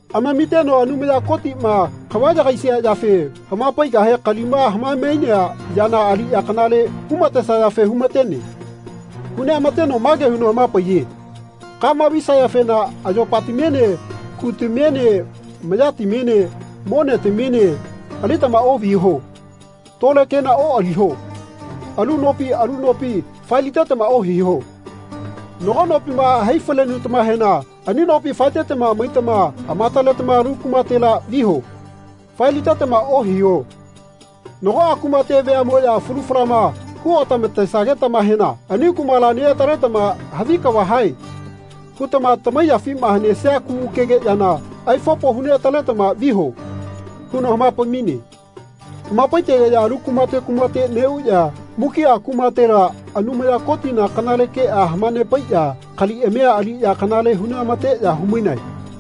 Amamiteno Anumaya Kotiꞌma kava yagaisia yafe hamapaigahe kalima hamaemainea yana aliꞌya kanale humatesayafe humatene. Huneꞌamateno mage huno hamapaiye “Kama visayafena ayopatamiene kutamiene mayatamiene monetamiene alitama oꞌviho. Tole kena oꞌaliho. Alu nopi alu nopi faelitetama ohiho. Nago nopima hai falenutamahena ani nopi faetama maitama amataletama alu kumatela viho. Faelitetama ohiho. Nagoꞌa kumate veaꞌmoꞌya falu falama huotamatesagetamahena ani kumala neꞌataletama ‘Havi kava hae.’ hutama tamaiyafima hanesia kugukege yana aifopo huneꞌataletama viho.” huno hamapaimaine. Hamapaitegeꞌya alu kumate kumate neꞌuꞌya mukiꞌa kumatela Anumaya Kotina kanale keꞌa hamanepaiꞌya kaliꞌamia aliꞌya kanale huneꞌamateꞌya humainae.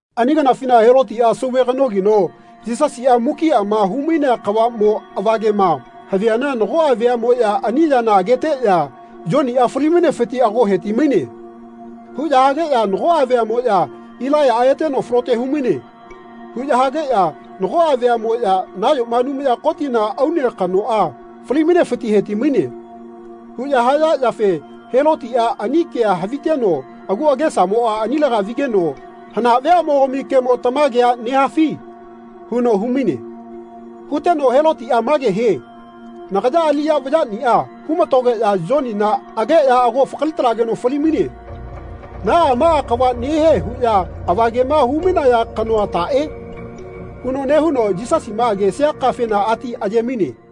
Ani kanafina Helotiꞌa sauve kanogino Yisasiꞌa mukiꞌama humainea kavaꞌmo avagema haviana nagoꞌa veaꞌmoꞌya ani yana ageteꞌya “Yoniꞌa falimainefiti ago hetimaine.” huꞌya hageꞌya nagoꞌa veaꞌmoꞌya “Ilaiyaꞌa eteno falote humaine.” huꞌya hageꞌya nagoꞌa veaꞌmoꞌya “Nayoma Anumaya Kotina aune kanoꞌa falimainefiti hetimaine.” huꞌya haya yafe Helotiꞌa ani kea haviteno agu agesamoꞌa anilega vigeno “Hana veaꞌmogami kemo tamagea nehafi?” huno humaine. Huteno Helotiꞌa mage hie “Nagaya aliꞌya vayaꞌniꞌa humatogeꞌya Yonina ageꞌya ago fakalitalageno falimaine. Naꞌa maꞌa kava nehie huꞌya avagema humainaya kanoa taꞌe?” huno nehuno Yisasima agesia kafena ati ayemaine.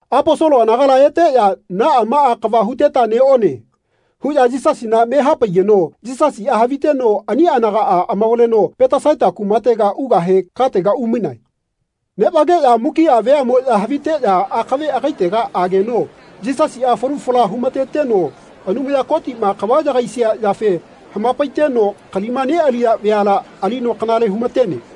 Aposolo anagala eteꞌya “Naꞌa maꞌa kava huteta neꞌone.” huꞌya Yisasina me hapaigeno Yisasiꞌa haviteno ani anagaꞌa amavaleno Petesaita kumatega ugahe katega umainae. Neꞌvageꞌya mukiꞌa veaꞌmoꞌya haviteꞌya akave agaitega ageno Yisasiꞌa falu fala humateteno Anumaya Kotiꞌma kava yagaisia yafe hamapaiteno kalima neꞌaliya veala alino kanale humatene.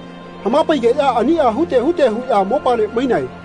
Hamapaigeꞌya aniꞌa hute hute huꞌya mopale mainae.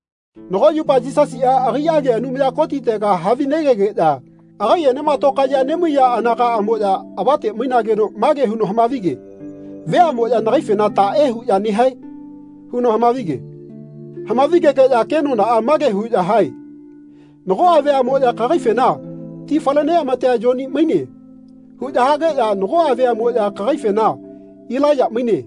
Nago yupa Yisasiꞌa agaiꞌage Anumaya Kotitega havinegegeꞌya agaiꞌenema tokaeꞌya nemaiya anagaꞌamoꞌya avate mainageno mage huno hamavige “Veaꞌmoꞌya nagaifena taꞌe huꞌya nehae?” huno hamavige. Hamavigegeꞌya kenonaꞌa mage huꞌya hae “Nagoꞌa veaꞌmoꞌya kagaifena ‘Ti faleneꞌamatea Yoni maine.’ huꞌya hageꞌya nagoꞌa veaꞌmoꞌya kagaifena ‘Ilaiya maine.’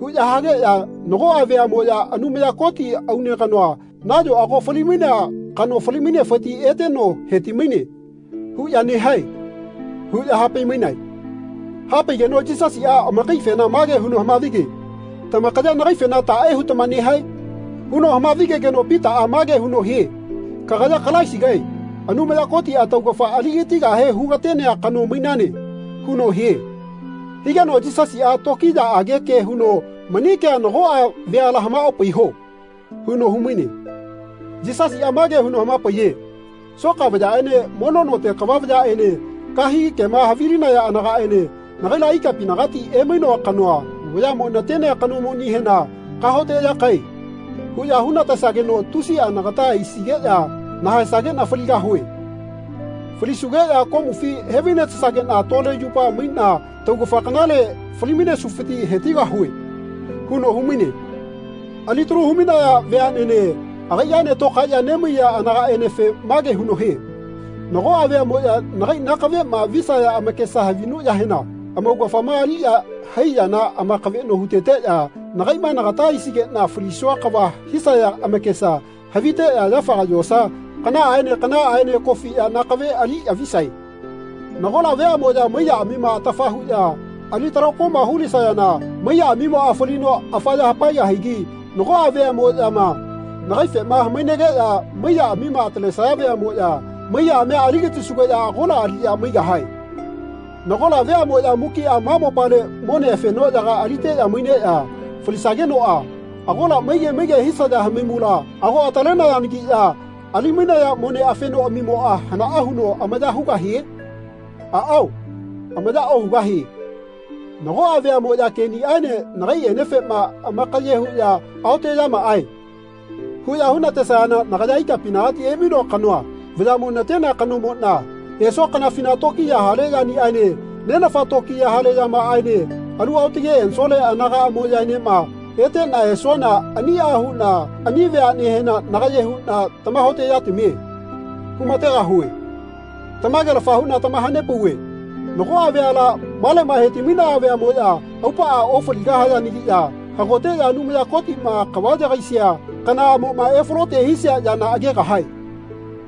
huꞌya hageꞌya nagoꞌa veaꞌmoꞌya ‘Anumaya Koti aune kanoa nayo ago falimainea kano falimainefiti eteno hetimaine.’ huꞌya nehae.” huꞌya hapaimainae. Hapaigeno Yisasiꞌa amakaifena mage huno hamavige “Tamakaya nagaifena taꞌe hutama nehae?” huno hamavigegeno Pitaꞌa mage huno hie “Kagaya Kalaisigae Anumaya Kotiꞌa taugafa aligatigahe hugatenea kano mainane.” huno hie. Higeno Yisasiꞌa tokiyaꞌage ke huno “Mani kea nagoꞌa veala hamaopaiho.” huno humaine. Yisasiꞌa mage huno hamapaiye “Soka vayaꞌene mono note kava vayaꞌene kahegi kema havilinaya anagaꞌene nagaila ikapinagati emainoa kanoa vayaꞌmo natenea kanomonihena ‘Kahaoteꞌyakae.’ huꞌya hunatesageno tusiꞌa nagata aisigeꞌya nahaesageꞌna faligahue. Falisugeꞌya komufi hevainatesageꞌna tole yupa maiꞌna tagufa kanale falimainesufiti hetigahue.” huno humaine. Alitalu humaiya veaꞌnene agaiꞌaene tokaeꞌya nemaiya anagaꞌenefe mage huno hie “Nagoꞌa veaꞌmoꞌya nagai nakaveꞌma visaya amakesa havinuꞌyahena amaugafama aliꞌya hai yana amakaveꞌno huteteꞌya nakaiꞌma nagata aisigeꞌna falisua kava hisaya amakesa haviteꞌya yafaga yosa kanaꞌaene kanaꞌaene kofiꞌya nakave aliꞌya visae. Nagola veaꞌmoꞌya maiyaꞌamima atafa huꞌya ali talakoma hulisayana maiyaꞌamimoꞌa falino afaya hapaegahigi nagoꞌa veaꞌmoꞌyama nagaifema hamainageꞌya maiyaꞌamima atalesaya veaꞌmoꞌya maiyaꞌamia aligatisugeꞌya agola aliꞌya maigahie. Nagola veaꞌmoꞌya mukiꞌa ma mopale mone fenoꞌyaga aliteꞌya maineꞌya falisagenoꞌa agola maige maige hisaya haimula ago atalenayanagiꞌya alimainaya mone fenoꞌamimoꞌa hanaꞌa huno amaya hugahie? Aꞌao amaya ohugahie. Nagoꞌa veaꞌmoꞌya keꞌniꞌaene nagaiꞌenefema amakaye huꞌya ‘Aoteꞌyamaꞌae.’ huꞌya hunatesayana nagaya ikapinagati emainoa kanoa vayaꞌmo natenea kanomoꞌna esua kanafina tokiya hale yaniꞌaene Nenafana tokiya hale yamaꞌaene alu aotage ensole anagaꞌamoꞌyaenema eteꞌna esuana aniꞌa huꞌna ani veaꞌnehena nagaye huꞌna ‘Tamahaoteꞌyatamie.’ humategahue. Tamagelafa huꞌna tamahanepauve nagoꞌa veala maleꞌma hetimainaya veaꞌmoꞌya aupaꞌa ofaligahayanagiꞌya hagoteꞌya Anumaya Kotiꞌma kava yagaisia kanaꞌamoꞌma efalote hisia yana agegahae.”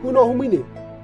huno humaine.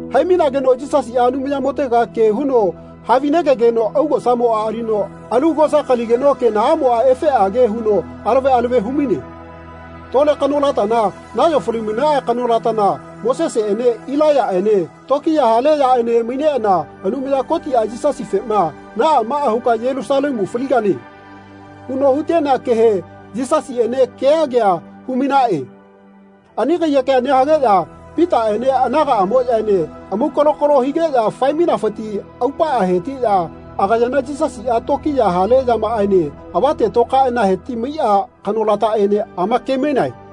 Haimainageno Yisasiꞌa Anumayamotega ke huno havinegegeno augosamoꞌa alino alu augosa kaligeno kenaꞌamoꞌa efeꞌage huno alave alave humaine. Tole kanolatana nayo falimainaꞌa kanolatana Moseseꞌene Ilaiyaꞌene tokiya hale yaꞌene maineꞌana Anumaya Kotiꞌa Yisasifema “Naꞌa maꞌa huka Yelusalemu faligane.” huno hutenea kehe Yisasiꞌene kea kea humainaꞌe. Ani kaiyekea nehageꞌya Pitaꞌene anagaꞌamoꞌyaene amaukalokalo higeꞌya faemainafiti aupaꞌa hetiꞌya agayana Yisasiꞌa tokiya hale yamaꞌaene avate tokaeꞌana hetimaiꞌa kanolataꞌene amakemainae.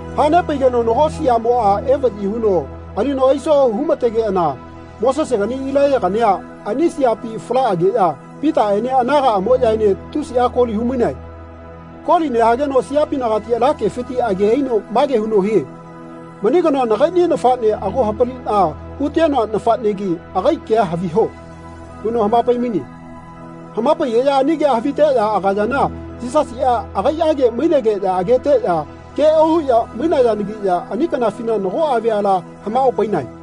Hanepaigeno nago siaꞌmoꞌa evaꞌyi huno alino aiso humategeꞌana Mosesegani Ilaiyagania ani siapi falaꞌageꞌya Pitaꞌene anagaꞌamoꞌyaene tusiꞌa koli humainae. Koli nehageno siapinagati ala kefiti age aino mage huno hie “Mani kanoa nagaiꞌni nafaꞌne ago hapaliꞌna hutenoa nafaꞌnegi agai kea haviho.” huno hamapaimaine. Hamapaigeꞌya ani kea haviteꞌya agayana Yisasiꞌa agaiꞌage mainegeꞌya ageteꞌya ke ohuꞌya mainayanagiꞌya ani kanafina nagoꞌa veala hamaꞌopainae.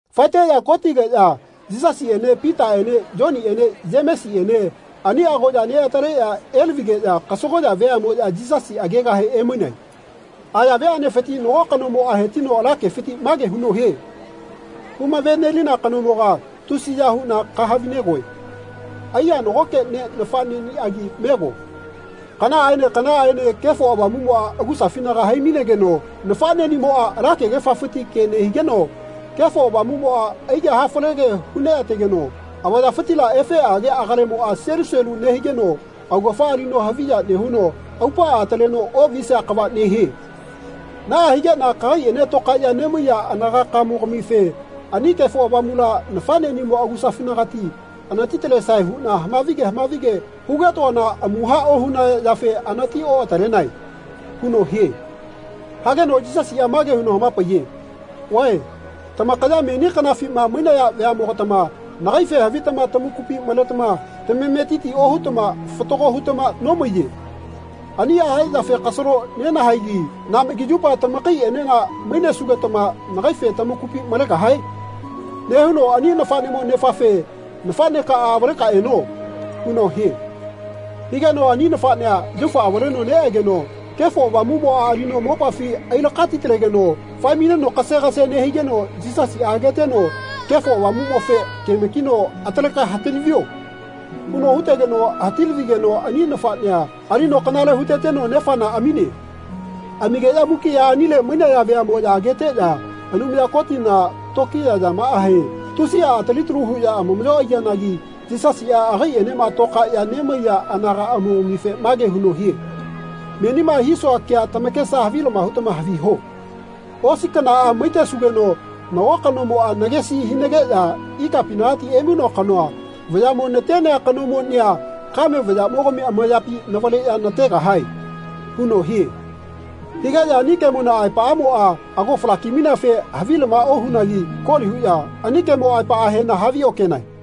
Faeteꞌya kotigeꞌya Yisasiꞌene Pitaꞌene Yoniꞌene Yemesiꞌene ani agoꞌya neꞌataleꞌya elavigeꞌya kasagoꞌya veaꞌmoꞌya Yisasi agegahe emainae. Aya veaꞌnefiti nago kanomoꞌa hetino ala kefiti mage huno hie “Humavenelina kanomoga tusiya huꞌna kahavinegoe. Aiya nagoke ne nafaꞌneꞌniꞌagi mego. Kanaꞌaene kanaꞌaene Kefo Avamuꞌmoꞌa agusafinaga haimainegeno nafaꞌneꞌnimoꞌa ala kegefafiti ke nehigeno Kefo Avamuꞌmoꞌa aige hafalege huneꞌategeno avayafitila efeꞌage agalemoꞌa selu selu nehigeno augafa alino haviya nehuno aupaꞌa ataleno oꞌvisia kava nehie. Naꞌa higeꞌna kagaiꞌene tokaeꞌya nemaiya anagakaꞌmogamife ani Kefo Avamula nafaꞌneꞌnimo agusafinagati anatitalesae huꞌna hamavige hamavige hugetoana amuha ohunaya yafe anati oꞌatalenae.” huno hie. Higeno Yisasiꞌa mage huno hamapaiye “Vae tamakaya meni kanafima mainaya veaꞌmogatama nagaife havitama tamakupi maletama tametiti ohutama fatago hutama nomaiye. Aniꞌa haya yafe kasalo nenahaegi naꞌmagi yupa tamakaiꞌenena mainesugetama nagaife tamakupi malegahae?” nehuno ani nafaꞌnemo nefafe “Nafaꞌnekaꞌa avaleka eno.” huno hie. Higeno ani nafaꞌnea yaufa avaleno neꞌegeno Kefo Avamuꞌmoꞌa alino mopafi ailakatitalegeno faemaineno kasegase nehigeno Yisasiꞌa ageteno Kefo Avamuꞌmofe kemakino “Ataleka hatilavio.” huno hutegeno hatilavigeno ani nafaꞌnea alino kanale huteteno nefana amine. Amigeꞌya mukiꞌa anile mainaya veaꞌmoꞌya ageteꞌya Anumaya Kotina tokiya yamaꞌahe tusiꞌa atalitalu huꞌya amamaꞌyo aiyanagi Yisasiꞌa agaiꞌenema tokaeꞌya nemaiya anagaꞌamogamife mage huno hie “Menima hisua kea tamakesa havilama hutama haviho. Osi kanaꞌa maitesugeno nago kanomoꞌa nagesi hinageꞌya ikapinagati emainoa kanoa vayaꞌmo natenea kanomonia kame vayaꞌmogami amayapi navaleꞌya nategahae.” huno hie. Higeꞌya ani kemona aepaꞌamoꞌa ago falakimaineafe havilama ohunagi koli huꞌya ani kemo aepaꞌahena haviokenae.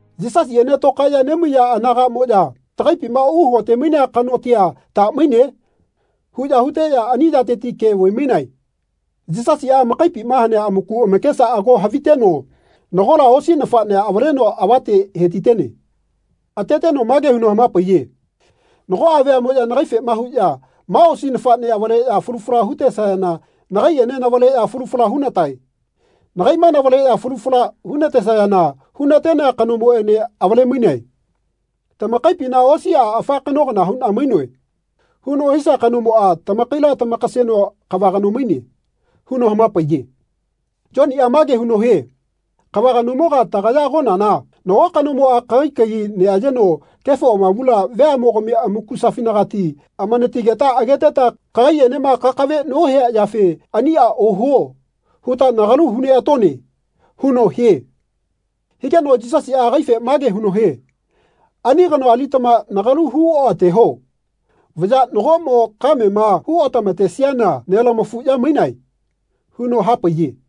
Yisasiꞌene tokaeꞌya nemaiya anagaꞌmoꞌya “Tagaipima uhakotemainea kanotia ta maine?” huꞌya huteꞌya ani yateti ke vaimainae. Yisasiꞌa amakaipima hanea amaku amakesa ago haviteno nagola osi nafaꞌnea avaleno avate hetitene. Ateteno mage huno hamapaiye “Nagoꞌa veaꞌmoꞌya nagaifema huꞌya ma osi nafaꞌne avaleꞌya falu fala hutesayana nagaiꞌene navaleꞌya falu fala hunatae. Nagaiꞌma navaleꞌya falu fala hunatesayana hunatenea kanoene avalemainae. Tamakaipina ‘Osiꞌa afa kano kana huꞌna mainoe.’ huno hisia kanomoꞌa tamakaila tamakaseno kava kano maine.” huno hamapaiye. Yoniꞌa mage huno hie “Kava kanomoga tagaya agonana nago kanomoꞌa kagai kagi neꞌayeno Kefo Avamula veaꞌmogami amakusafinagati amanatigeta ageteta kagaiꞌenema kakave nohia yafe ‘Aniꞌa ohuo.’ huta nagalu huneꞌatone.” huno hie. Higeno Yisasiꞌa agaife mage huno hie “Ani kanoa alitama nagalu hu oꞌateho. Vaya nagoꞌmo kamema hu otamatesiana nelamafuꞌya mainae.” huno hapaiye.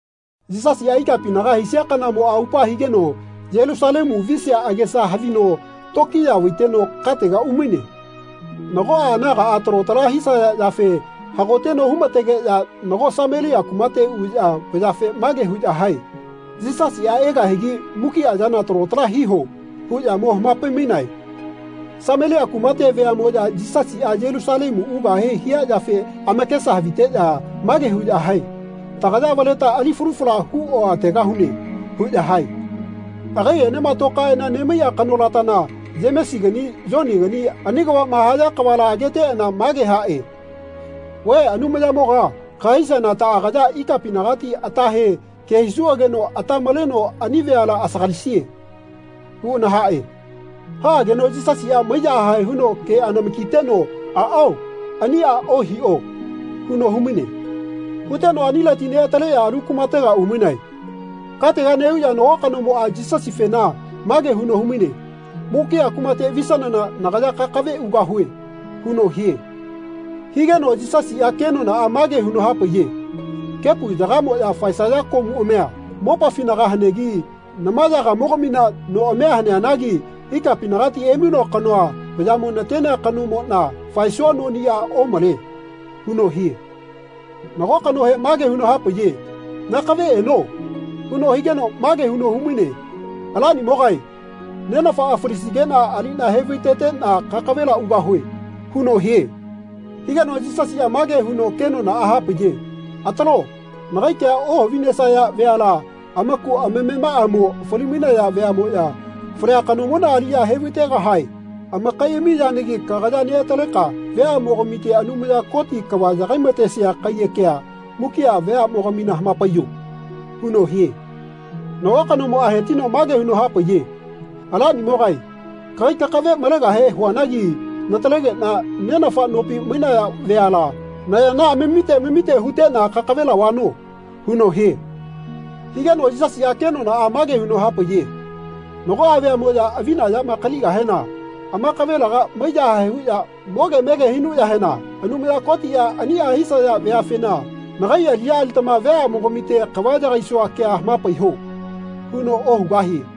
Yisasiꞌa ikapinaga haisia kanamoꞌa aupa higeno Yelusalemu visia agesa havino tokiya vaiteno katega umaine. Nagoꞌa anagaꞌa talo tala hisaya yafe hagoteno humategeꞌya nago Samelia kumate uꞌya vayafe mage huꞌya hae “Yisasiꞌa egahigi mukiꞌa yana talo tala hiho.” huꞌya mo hamapaimainae. Samelia kumate veaꞌmoꞌya Yisasiꞌa Yelusalemu ugahe hia yafe amakesa haviteꞌya mage huꞌya hae “Tagaya avaleta ali falu fala hu oꞌategahune.” huꞌya hae. Agaiꞌenema toꞌkaeꞌana nemaiꞌa kanolatana Yemesigani Yonigani ani kavaꞌma haya kavala ageteꞌana mage haꞌe “Vae Anumayamoga kahaisiana taꞌagaya ikapinagati atahe ke hisuꞌageno ata maleno ani veala asagalisie?” huꞌana haꞌe. Haꞌageno Yisasiꞌa maiyahae huno keꞌanamakiteno “Aꞌao aniꞌa ohiꞌo.” huno humaine. Huteno anileti neꞌataleꞌya alu kumatega umainae. Katega neꞌuꞌya nago kanomoꞌa Yisasifena mage huno humaine “Mukiꞌa kumate visanana nagaya kakave ugahue.” huno hie. Higeno Yisasiꞌa kenonaꞌa mage huno hapaiye “Kepu yagamoꞌya faesaya komuꞌamia mopafinaga hanegi namamogamina noꞌamia haneanagi ikapinagati emainoa kanoa vayaꞌmo natenea kanomoꞌna faesua noniꞌa omale.” huno hie. Nago kanohe mage huno hapaiye “Nakave eno.” huno higeno mage huno humaine “Alanimogae nenafana falisigeꞌna aliꞌna hevaiteteꞌna kakavela ugahue.” huno hie. Higeno Yisasiꞌa mage huno kenonaꞌa hapaiye “Atalo nagai kea ohavinesaya veala amaku amamemaꞌamo falimainaya veaꞌmoꞌya falia kanomona aliꞌya hevaitegahae amakaiꞌami yanagi kagaya neꞌataleka veaꞌmogamite Anumaya Koti kava yagaimatesia kaiyekea mukiꞌa veaꞌmogamina hamapaiyo.” huno hie. Nago kanomoꞌa hetino mage huno hapaiye “Alanimogae kagai kakave malegahe huanagi natalegeꞌna nenafa nopi mainaya veala nayana amamite amamite huteꞌna kakavela vano.” huno hie. Higeno Yisasiꞌa kenonaꞌa mage huno hapaiye “Nagoꞌa veamoꞌya avina yama kaligahena amakavelega maiyahae huꞌya moge mege hinuꞌyahena Anumaya Kotiꞌa aniꞌa hisaya veafena ‘Nagai aliꞌya alitama veamogamite kava yakaisua kea hamapaiho.’ huno ohugahie.”